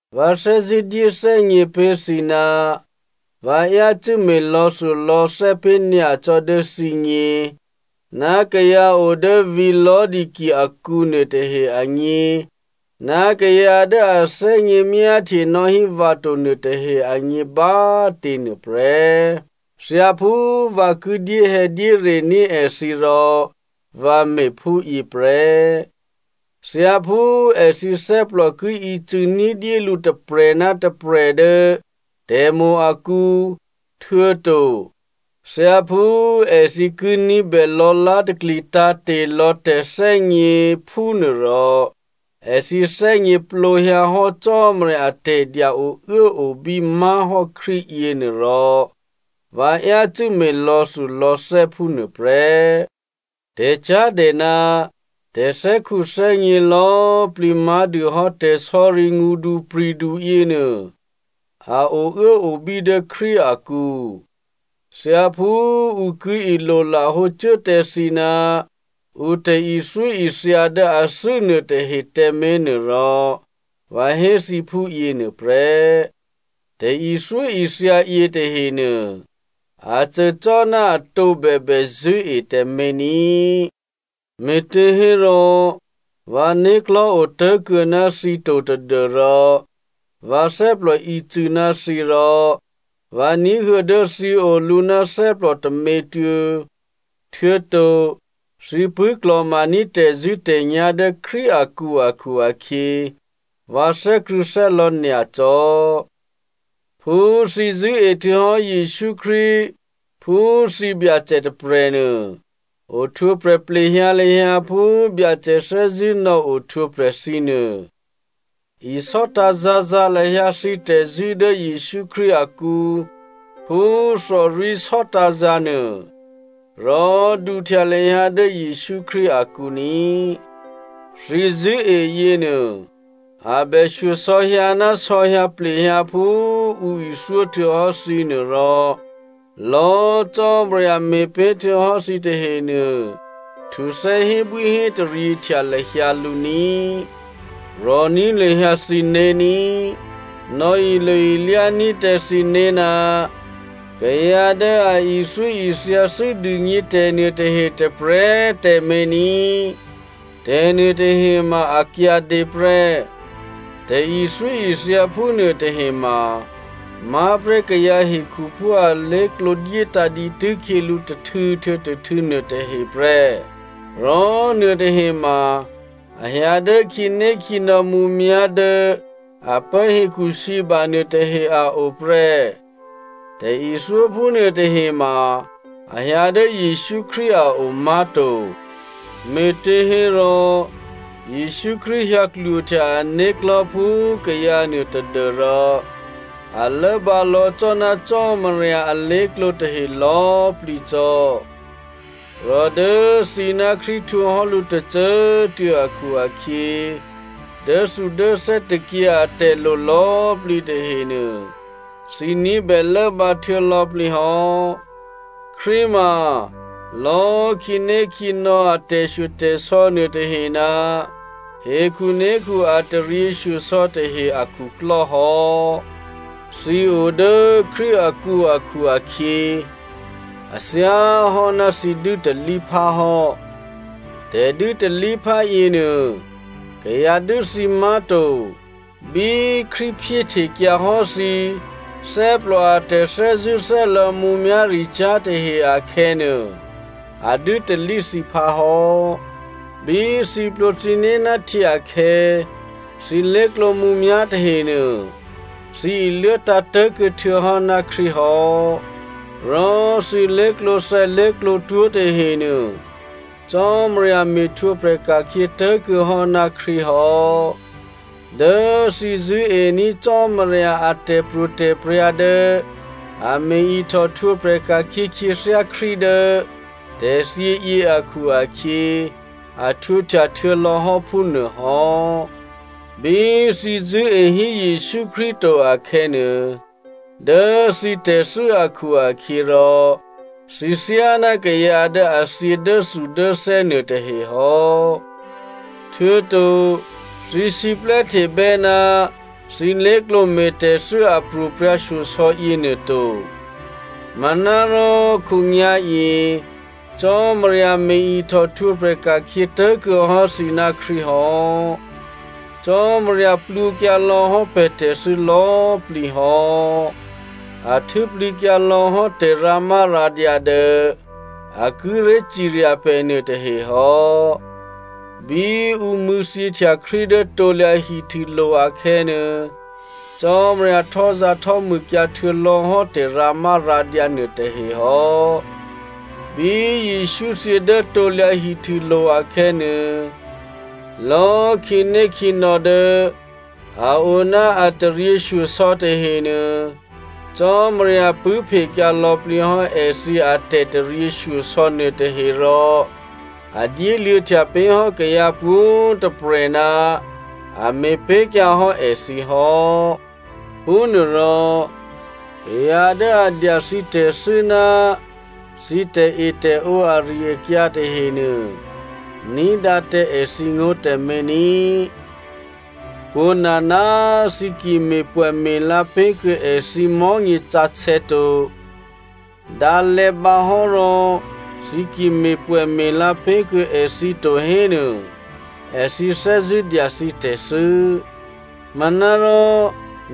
Vǎ thè́zṳ̂́ dyéthè́gně pé̤ thǐ ná vǎ yácû́ me̤ lò̌thulò̌thè́ pé̤ nyacò́ dố thǐgně ná kayǎ odố vǐ̤ Laodicea akǔ nuôtahe agně ná kayǎ dố a thè́gně myáhtye nò́hí vǎ to nuôtahe agně bá꤮ tě nuôprè́. Thyáphú vǎ ki dyéhè̌dyérení̤ èthǐ rò vǎ me̤phúyě prè́. Thyáphú èthǐ thè́plò ki ícû̌ ní̤dyé lǔ tôprè̤ ná tôprè̤ dố tè̤mo̤ akǔ htuô̌to thyáphú èthǐ ki ní̤bè lò̌lá̤takli tǎ̤te̤lò̌ tè̤thè́gně, phúnuôrò èthǐ thè́gněplǒhyǎhò́ Cò́marya atè̤dya ouốobí má̤hò́ Krístu yěnuô rò vǎ yácû́ me̤ lò̌thulò̌thè́ phúnuô prè́. Tè̤cyá̤dè ná tè̤thè́khuthè́gně lò̌꤮ plǐ má̤dûhò́ tè̤sò̌ri ngṳdupri̤du yěnuô, a ouốobí dố Krístu akǔ. Thyáphú ǔ ki ilolahǒ cuố tǎ thǐ ná ǔ tè̤ithyóithya dố athû́ nuôtahe tǎmé̤ nuôrò vǎ hé thǐ phúyě nuôprè́. Tè̤ithyóithya yětahenuô, a cô cò́ ná atǒ bèbè, zṳ̂́e tǎmé̤ ní꤮. Me̤těhérò, vǎ né̤klò̤́ otố̤kuô̌ ná thǐ to tadû́rò vǎ thè́plò ícû̌ ná thǐ rò vǎ ní̤huô̌ dố thǐ olǔ ná thè́plò tômětuô̌, htuô̌to thǐ pṳ̂́klò̤maní̤ tè̤zṳ̂́tè̤nyá̤ dố Krístu akǔ akhu-akhyě, vǎ thè́krṳ̂̌thè́lò̌ nyacò́. Phú thǐ zṳ̂́e htuô̌hò́ Jesǔ Krístu phú thǐ Byacè tôprè̤nuô, ohtwǒprè̤ plehyǎ lahyǎ phú Byacè thè́zṳ̂́ nò̌ohtwǒprè̤ thǐ nuô. Isò́tǎ̤ zǎ̤zǎ̤ lahyǎ thǐ tè̤zṳ̂́ dố Jesǔ Krístu akǔ phú thòrwí̤ sò́tǎ̤zǎ̤ nuô. Rò duhtya lahyǎ dố Jesǔ Krístu akǔ ní꤮. Thǐ zṳ̂́e yěnuô a bè shyosò̌hyǎ ná sò̌hyǎ plehyǎ phú ǔ ithyó htuô̌hò́ thǐ nuô, rò lò̌꤮ Cò́marya me̤pé̤ htuô̌hò́ thǐ tahenuô, htuthè́ hébwíhétaryě htya lahyǎ lǔ ní꤮. Rò̤ní̤ lahyǎ thǐné̤ ní꤮. Nò̌ilo-ilyá ní̤ tǎ thǐné̤ ná kayǎ dố a ithyóithyathû́ dûgně tè̤nuôtahe tôprè̤꤮ tǎmé̤ ní꤮. Tè̤nuôtahe ma a kyǎdě prè́. Tè̤ithyóithya phúnuô tahema má̤prè́ kayǎ hekhuphú alé̤klǒ dyétǎ̤ dǐtû́ khyělǔ tôhtû̌ htuô̌ tôhtû̌ nuôtahe prè́. Rò nuôtahe ma a hyǎ dố khǐnékhǐnò̌ mǔmyá̤ dố a pố hekhusǐba nuôtahe a o prè́. Tè̤ithyó phúnuô tahema a hyǎ dố Jesǔ Krístu a o má̤to. Me̤těhérò Jesǔ Krístu hyǎ klwohtya ané̤klò̤́ phú kayǎ nuô tadû́rò, a lốbǎ lò̌ cò́ ná Cò́marya alé̤klǒ tahe lò̌꤮ plǐ cò́. Rò dố thǐ ná Krístu htwǒhò́ lǔ tôcô꤮ tuô̌ akhu-akhyě, dốthudốthè́ tôkyě atè̤lo lò̌꤮ plǐ tahenuô, thǐ ní̤bè lốbǎ htuô̌lò̌plǐ hò́. Krístu ma lò̌꤮ khǐnékhǐnò̌ a tè̤shyotè̤sò̌ nuôtahe ná hekhunékhu a taryěshyosò̌ tahe akhuklò́ hò́. Thǐ o dố Krístu akǔ akhu-akhyě a thyáhò́ ná thǐ dû́talíphá hò́. Tè̤dû́talíphá yěnuô kayǎ dû́ thǐ má̤to. Bí Krístu phyéhtekyǎ hò́ thǐ thè́plò a tè̤thè́zṳ̂́thè́lò̌ mǔmyá̤ricyá̤ tahe akhè̌nuô, a dû́talí thǐphá hò́. Bí thǐ plwǒ thǐné̤ ná htyě akhè̌, thǐ lé̤klǒ mǔmyá̤ tahenuô, thǐ iluốtǎ̤ tố̤kuô̌ htuô̌hò́ ná Krístu hò́, rò thǐ lé̤klǒthè̌lé̤klǒtwó̤ tahenuô, Cò́marya me̤htwǒprè̤ ka̤khyě tố̤kuô̌ hò́ ná Krístu hò́. Dố thǐ zṳ̂́ení̤ Cò́marya a tè̤pro̤tè̤prya̤ dố a me̤ ihtòhtwǒprè̤ ka̤khyě khyěthyá Krístu dố tè̤thyě yě akhu-akhyě, a htwǒhtya htuô̌lò̌ hò́ phúnuô hò́. Bí thǐ zṳ̂́e hí Jesǔ Krístu to akhè̌nuô, dố thǐ tè̤thû́ akhu-akhyěrò, thǐ thyáná kayǎ dố a thyě dốthudốthè́ nuôtahe hò́. Htuô̌to thǐ siplè́htebè́ ná thǐ lé̤klǒ me̤tè̤thû́ a pro̤prya̤shyosò̌ yěnuô to. Manárò khǒnyá̤yě Cò́marya me̤ ihtòhtwǒprè̤ ka̤khyě tố̤kuô̌ hò́ thǐ ná Krístu hò́. Cò́marya plwǒkyǎ lò̌hò́ pè̤ tè̤thû́ lò̌꤮ plǐ hò́. A htû́plǐkyǎ lò̌ hò́ tè̤rǎmárǎdyǎ dố a kíré̤ cirya pè̤ nuôtahe hò́. Bí ǔ mṳ̂̌thyěhtya Krístu dố krusulo̤ akhè̌nuô, Cò́marya htò́zǎ̤htò́mûkyǎ htuô̌ lò̌hò́ tè̤rǎmárǎdyǎ nuôtahe hò́. Bí Jesǔ thyě dố krusulo̤ akhè̌nuô, lò̌꤮ khǐnékhǐnò̌ dố a o ná a taryěshyosò̌ tahenuô, Cò́marya pṳ̂́phekyǎ lò̌plǐ hò́ èthǐ atè̤taryěshyosò̌ nuôtahe rò a dyéluô̌htya pé̤ hò́ kayǎ pwǒ̤꤮ tôprè̤ ná a me̤pé̤kyǎ hò́ èthǐ hò́. Phúnuôrò, kayǎ dố a dya thǐ tè̤thû́ ná thǐ tè̤etè̤ǒ ari-akyǎ tahenuô, ní̤dǎ tǎ èthǐngó̤ tǎmé̤ ní꤮. Pwǒ̤nana꤮ thǐ ki me̤pwè̌me̤la pé̤kuô̌ èthǐ mò̤́nyě sǎsè̌ to, dǎ lè̌bǎ hò́rò thǐ ki me̤pwè̌me̤la pé̤kuô̌ èthǐ to hénuô, èthǐ thè́zṳ̂́ dya thǐ tè̤thû́. Manárò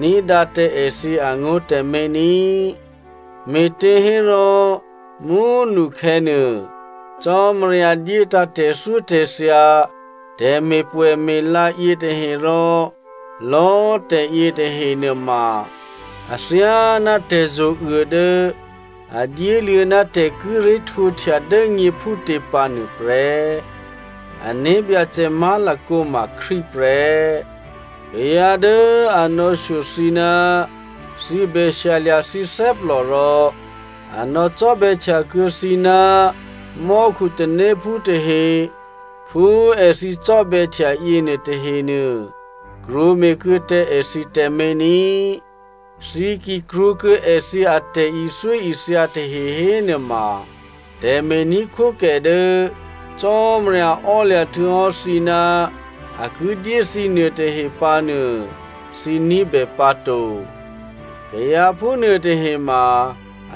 ní̤dǎ tǎ èthǐ angó̤ tǎmé̤ ní꤮. Me̤těhérò, mú꤮ nukhè̌nuô, Cò́marya dyétǎ̤ tè̤thyótè̤thya, tè̤me̤pwè̌me̤la yětahe rò lò̌꤮ tè̤ yětahe nuôma athyáná tè̤zo̤uô dố a dyéluô̌ ná tè̤ kíré̤ htwǒhtya dố nyě phútě pǎ nuôprè́. Ané̤byacè má̤lakǒ ma Krístu prè́. Kayǎ dố a nò̌shyo thǐ ná thǐ bè shyalya̤ thǐ thè́plò rò a nò̌cò́bè̌htya kuô̌ thǐ ná mò́khutanéphú tahe phú èthǐ cò́bè̌htya yěnuô tahenuô, krwǒme̤ kuô̌ tǎ èthǐ tǎmé̤ ní꤮. Thǐ ki krwǒkuô̌ èthǐ atè̤ithyóithya tahe hénuôma, tè̤me̤ní̤khwókè dố Cò́marya ò́lya̤ htuô̌hò́ thǐ ná a ki dyé thǐ nuôtahe pǎnuô, thǐ ní̤bè pǎ to. Kayǎ phúnuôtahe ma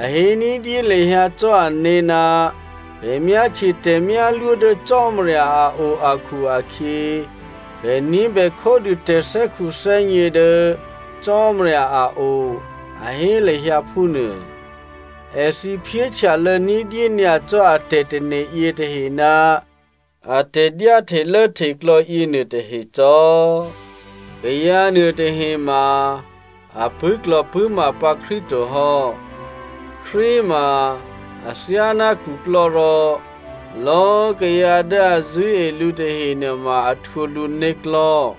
a hé ní̤dyé lahyǎ cò́ ané̤ ná pè̤ myáhtye tè̤myálwó dố Cò́marya a o akhu-akhyě, pè̤ ní̤bè khódû tè̤thè́khuthè́gně dố Cò́marya a o, a hé lahyǎ phúnuô. Èthǐ phyéhtyalô̌ ní̤dyé nyacò́ a tè̤tane̤ yětahe ná a tè̤dyáhtelốhteklò̌ yěnuôtahe cò́. Kayǎ nuôtahe ma a pṳ̂́klò̤pṳ̂́ma pǎ Krístu to hò́. Krístu ma athyáná khuklò́ rò lò̌꤮ kayǎ dố a zṳ̂́e lǔ tahe nuôma a htwǒ lǔ né̤klò̤́.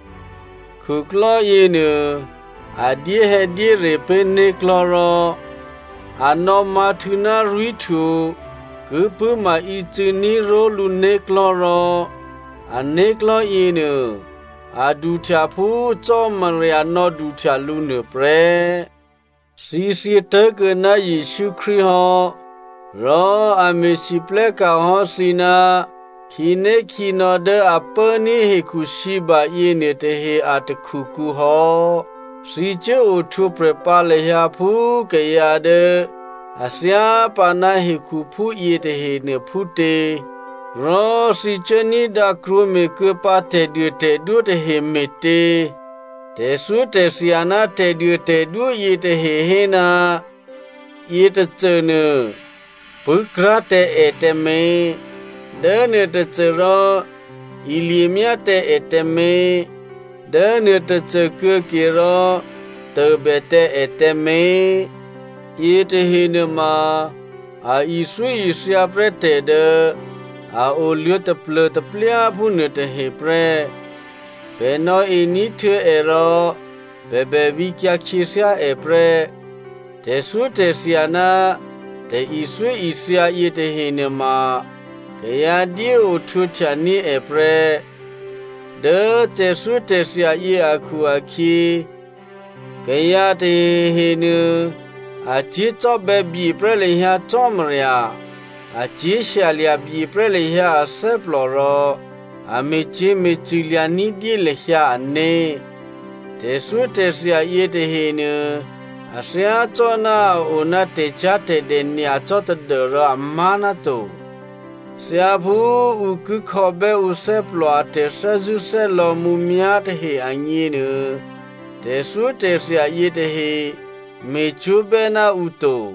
Khuklò́ yěnuô a dyéhè̌dyére pé̤ né̤klò̤́ rò a nò̌mǎ̤htû̌ ná rwí̤htwo ki pṳ̂́ma ícû̌ní̤ ró̤lǔ né̤klò̤́ rò a né̤klò̤́ yěnuô a duhtya phú Cò́marya nò̌duhtya lǔ nuôprè́. Thǐ thyě tố̤kuô̌ ná Jesǔ Krístu hò́ rò a me̤lwóhteka̤ hò́ thǐ ná khǐnékhǐnò̌ dố a pốní̤ hekhusǐba yěnuôtahe a takhukǔ hò́. Thǐ cuố ohtwǒprè̤ pǎ lahyǎ phú kayǎ dố a thyápǎ ná hekhuphú yětahenuô phútě? Rò thǐ cuố ní̤dǎ krwǒme̤kuô̌ pǎ tè̤duôtè̤dwó tahe me̤tě? Tè̤thyótè̤thya ná tè̤duôtè̤dwó yětahe hé, “Yětôcônuô pṳ̂́krá̤ tǎ è tǎmé̤,” “Dốnuôtôcô rò ilyemyá tǎ è tǎmé̤,” “Dố nuôtôcô kuô̌ke rò tôbè tǎ è tǎmé̤.” Yětahe nuôma a ithyóithya prè́ tè̤dố a oluô̌ taplô̤taplyáphú nuôtahe prè́. Pè̤ nò̌e ní̤htuô̌ è rò pè̤ bè vǐkyǎ khyěthyá è prè́. Tè̤thyótè̤thya ná tè̤ithyóithya yětahe nuôma kayǎ dyé ohtwǒhtyaní̤ è prè́. Dố tè̤thyótè̤thya yě akhu-akhyě kayǎ tahehenuô a cyé̤ cò́bè̌bye prè́ lahyǎ Cò́marya, a cyé̤ shyalya̤ byeprè́ lahyǎ athè́plò rò a me̤cyě̤me̤cṳ̂ lya̤ ní̤dyé lahyǎ ané̤. Tè̤thyótè̤thya yětahenuô a thyácò́ná a-o ná tè̤cyá̤tè̤dè nyacò́ tadû́rò amá̤ náto. Thyáphú ǔ ki khò̌bè́ ǔthè́plò a tè̤thè́zṳ̂́thè́lò̌ mǔmyá̤ tahe agněnuô, tè̤thyótè̤thya yětahe me̤cwó̤bè́ ná ǔ to.